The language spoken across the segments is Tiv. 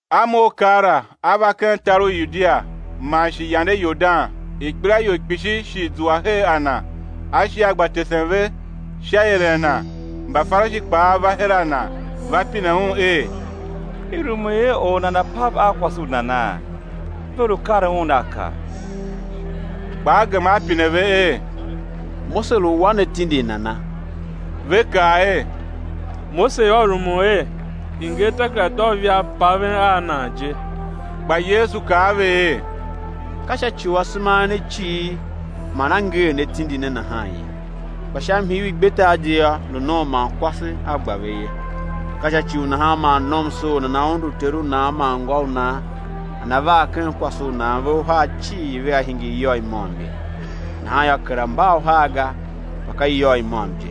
A mough keela A va ken tar u Yudia man shi yande Yordan; ikpelaior kpishi shi zua her a Na; A shi A gba tesen ve sha ieren Na. Mbafarishi kpaa va her a Na, va pine Un er: I rumun er or nana̱ pav a kwase u nana? Ve lu karen Un a kar. Kpa a A gema A pine ve er: Mose lu wa ne tindi nana? Ve kaa er: Mose yô, rumun er i̱ nger takerada u ivaa i paven, paven a nan je. Kpa Yesu kaa a ve er: Ka sha ci u asema a en a cighir man a nger ne tindi ne nahan ye. Kpa sha mhii u igbetar je yô, lu nom man kwase A gba ve ye. Ka sha ci u nahan man nomsoor nana undu ter u nan man ngô u nan, nana var hen kwase u nan; ve uhar cii vea hingir iyôgh i môm ye; nahan yô, kera mba uhar ga, kpa mba iyôgh i môm je.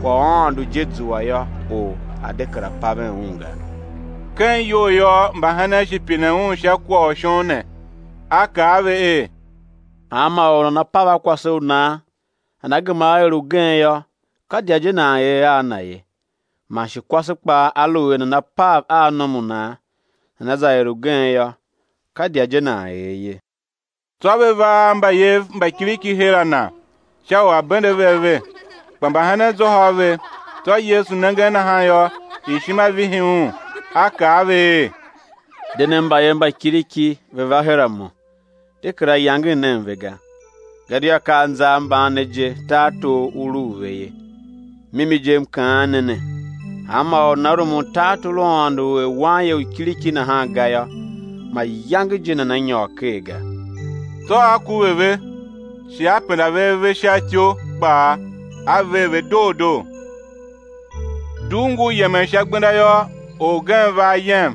Kwagh u Aôndo je zua yô, or a̱ de kera paven un ga. Ken iyou yô, mbahenen shi pine Un sha kwagh shon ne. A kaa a ve er: Hanma or u nana pav a kwase u nan, nana gema á er ugen yô, ka idya je nan er a na ye. Man shi kwase kpaa, aluer nana pav a nom u nan, nana za er ugen yô, ka idya je nan er ye. Tsô ve va a mbayev mba kiriki her a Na sha u A̱ bende ve ave, kpa mbahenen zôhô a ve. Tsô Yesu nengen nahan yô, ishima vihi Un, A kaa a ve er: De nen mbayev mba kiriki, ve̱ va her a Mo; de kera yangen nen ve ga, gadia ka anza a mban ne je tartor u lu u ve ye. Mimi je, M kaan ne ne, hanma or u nana rumun tartor u Aôndo er wanye u kiriki nahan ga yô, mayange je nana nyôr ker ga. Tsô A kuve ve, shi A penda ve ave sha ityou kpaa, A ver ve doo doo. Dugh ngur yemen sha gbenda yô, orgen va ayem,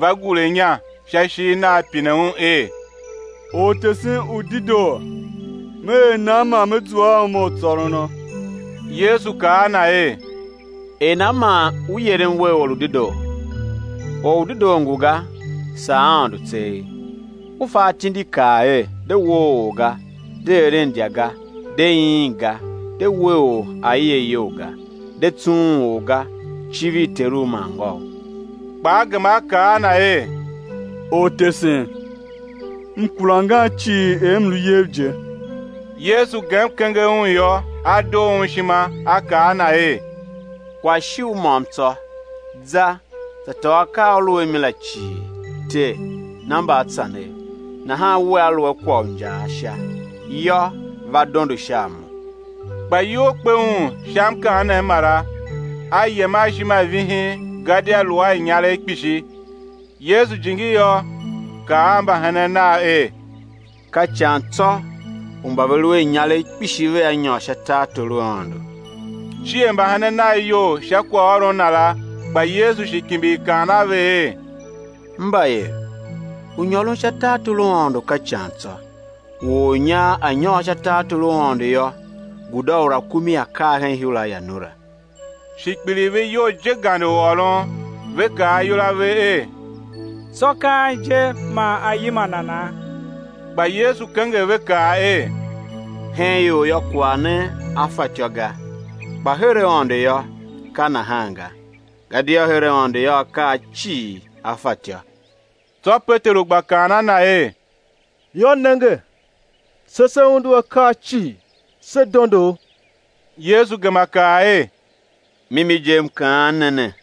va gure inya sha ishigh Nagh, pine Un er: Ortesen u dedoo, me er nan man me zua a uma u tsôrono? Yesu kaa a na er: Er nan man u yerem wer Or u dedoo? Or u dedoo ngu ga, saa Aôndo tseegh. U fa atindi kaa er: De woo or ga; de eren idya ga; de iin ga; de we or aie iyol ga; de tsughun or ga; civir teru man ngôu. Kpa a gema a kaa a Na er: Ortesen, m kura angan cii er m lu iyev je. Yesu gem kenger un yô, a doo Un ishima, a kaa a na er: Kwagh shi u môm tsô; za, za tôô akaa a u lu a mi la cii, tee, na mbaatsanev, nahan wea lu a kwagh u injaa Sha; yô, va dondo sha a Mo. Kpa iyol kpe un sha mkaanem mara, a yem a ishima i vihin, gadia lu a inyaregh kpishi. Yesu jingi yô, kaa a mbahenen Nav er: Ka ican tsô, u mba ve lu a inyaregh kpishi vea nyôr sha tartor u Aôndo. Cier mbahenen Nav iyol sha kwaghôron Na la. Kpa Yesu shi kimbir kaan a ve er: Mbayev, u nyôron sha tartor u Aôndo ka ican tsô. U ornyar a̱ nyôr sha tartor u Aôndo yô, guda u rakumi á kar hen ihura i anura. Shi kpiligh ve iyol, je gande u ôron; ve kaa ayol a ve er: Tsô, ka an je man á yima nana? Kpa Yesu kenger ve, kaa er: Hen ior yô, kwagh ne a fatyô ga, kpa her Aôndo yô, ka nahan ga; gadia her Aôndo yô, akaa cii á fatyô. Tsô Peteru gba kaan a Na er: Yô, nenge, se se undu akaa cii, se dondo U. Yesu gema kaa er: Mimi je, M kaan ne ne,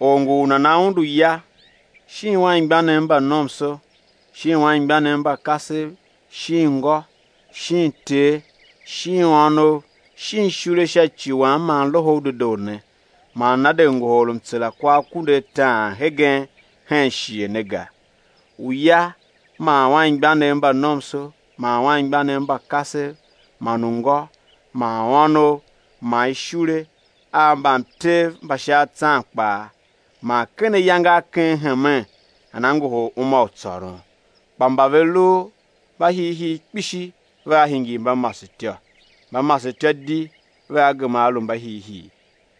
or ngu u nana undu ya, shin anmgbianev mba nomso, shin anmgbianev mba kasev, shin ngô, shin ter, shin ônov, shin ishule sha ci Wam man Loho u Dedoo ne, man nana de ngohol mtsera kwa akunduataan hegen hen shighe ne ga: uya man anmgbianev mba nomso man anmgbianev mba kasev man ungô man ônov man ishule a mbamtev mba sha atsan kpaa, man ken ayange a ken hemen, nana ngohol uma u tsôron. Kpa mba ve lu mbahiihii kpishi vea hingir mbamasetyô, mbamasetyô di vea gema á lu mbahiihii.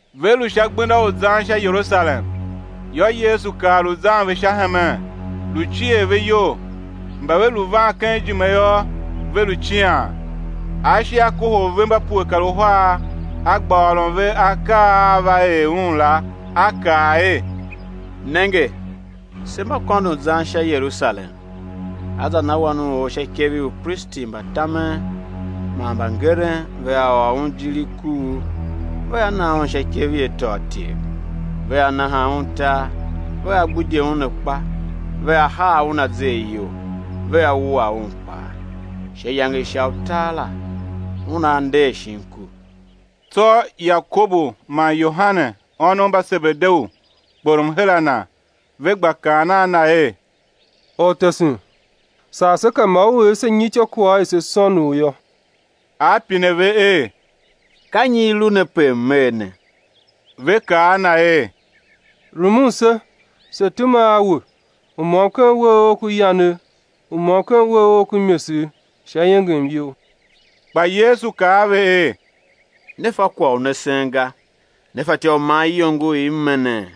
Ve lu sha gbenda u zan sha Yerusalem, yô, Yesu kar lu zan ve sha hemen, lu cier ve iyol; mba ve lu van ken ijime yô, ve lu cian. A shi A kohol ve mba pue kar uhar, A gba ôron ve akaa a á va er Un la. A kaa er: Nenge, se mba kôndon zan sha Yerusalem; á za na Wan u or sha ikev i upristi mba tamen man mbangeren, vea ôr Un ijir i kuugh, vea na Un sha ikev i atôatyev; vea naha Un tar, vea gbidye Un akpa, vea haa Un azer iyol, vea wua Un kpaa; sha iyange i sha utar la, Una nder shin ku. Tsô Yakobu man Yohane, ônov mba Sebedeu, kporom her a Na, ve gba kaan a Na er: Ortesen, sar se ka ma U er se nyi ityôkwagh i se sôn U yô. A pine ve er: Ka nyi i lu ne pe M̱ er ne? Ve kaa a Na er: Rumun se, se̱ tema a We, u môm ken uwegh Ough ku yanegh, u môm ken uwegh Ough ku imesegh, sha iengem You. Kpa Yesu kaa a ve er: Ne fa kwagh u ne sen ga. Ne fatyô u man iyongo i M me nee?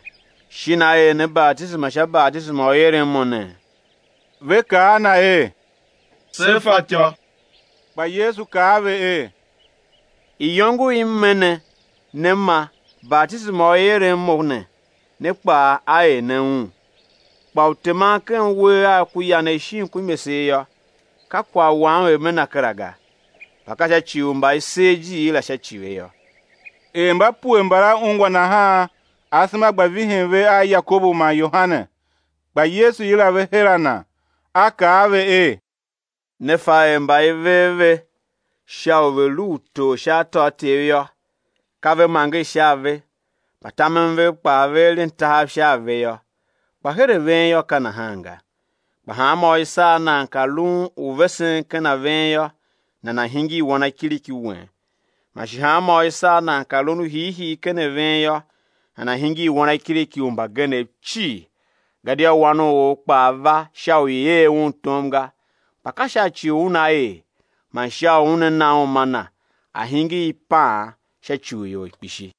Shin á er ne batisema sha batisema u i eren Mo ne? Ve kaa a Na er: Se fatyô. Kpa Yesu kaa a ve er: Iyongo i M me ne, né ma, batisema u i eren Mo ne, ne kpaa á er ne un, kpa u teman ken uwegh Agh ku yanegh shin ku imesegh yô, ka kwagh Wam er Me na kera ga; kpa ka sha ci u mba i ser ijiir la sha ci ve yô. Er mba pue mbala ungwa nahan, asema gba vihin ve a Yakobu man Yohane. Kpa Yesu yila ve her a Na, A kaa a ve er: Ne fa er mba i ver ve sha u ve̱ lu utor sha atôatyev yô, ka ve manger sha a ve, mbatamen vev kpaa ve eren tahav sha a ve yô. Kpa her a ven yô, ka nahan ga; kpa hanmô u i sar nan pe lun u vesen ken a ven yô, nana̱ hingir wanakiriki wen. Man shi hanmô u i sar nan pe lun u hiihii ken a ven yô, nana̱ hingir wanakiriki u mbagenev cii. Gadia Wan u or kpaa va sha u i̱ er Un tom ga kpa ka sha ci u Una er, man sha u Una na uma Na a̱ hingir ipaan sha ci u ior kpishi.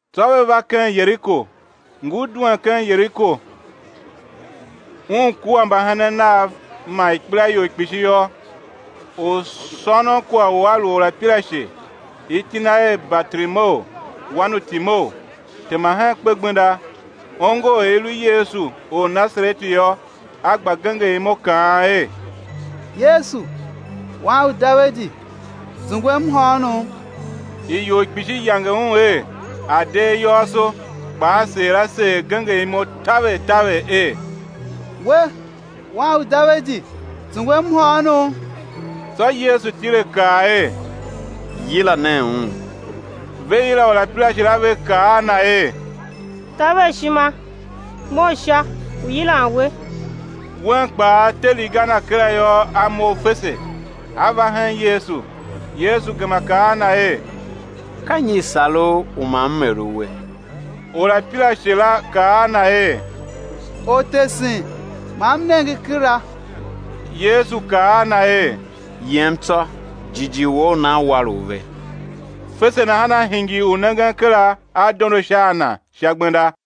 Tsô ve va ken Yeriko. Ngur duen ken Yeriko, Un kua mbahenen Nav man ikpelaior kpishi yô, orsônonkwagh u a lu orapirashe, iti na er Bartimeu, wan u Timeu, tema hen kpegbenda. Ongo er i lu Yesu or u Nasareti yô, a gba genger imo kaan er: Yesu, Wan u Davidi, zungwem mhôônom. Ior kpishi yange un er, a̱ de ayôôso; kpa a seer a seer genger imo taver taver er: We, Wan u Davidi zungwem mhôônom. Tsô Yesu tile, kaa er: Yila nen un. Ve yila orapirashe la, ve kaa a na er: Taver ishima, mough sha, ngu yilan we. Un kpaa, te riga na kera yô, a mough fese, a va hen Yesu. Yesu gema kaa a Na er: Ka nyi i̱ sar u, u ma M er uwe? Orapirashe la kaa a Na er: Ortesen, ma m nenge kera. Yesu kaa a na er: Yem tsô, jighjigh wou u nan war u ve. Fese nahan a hingir u nengen kera, a dondo sha a Na sha gbenda.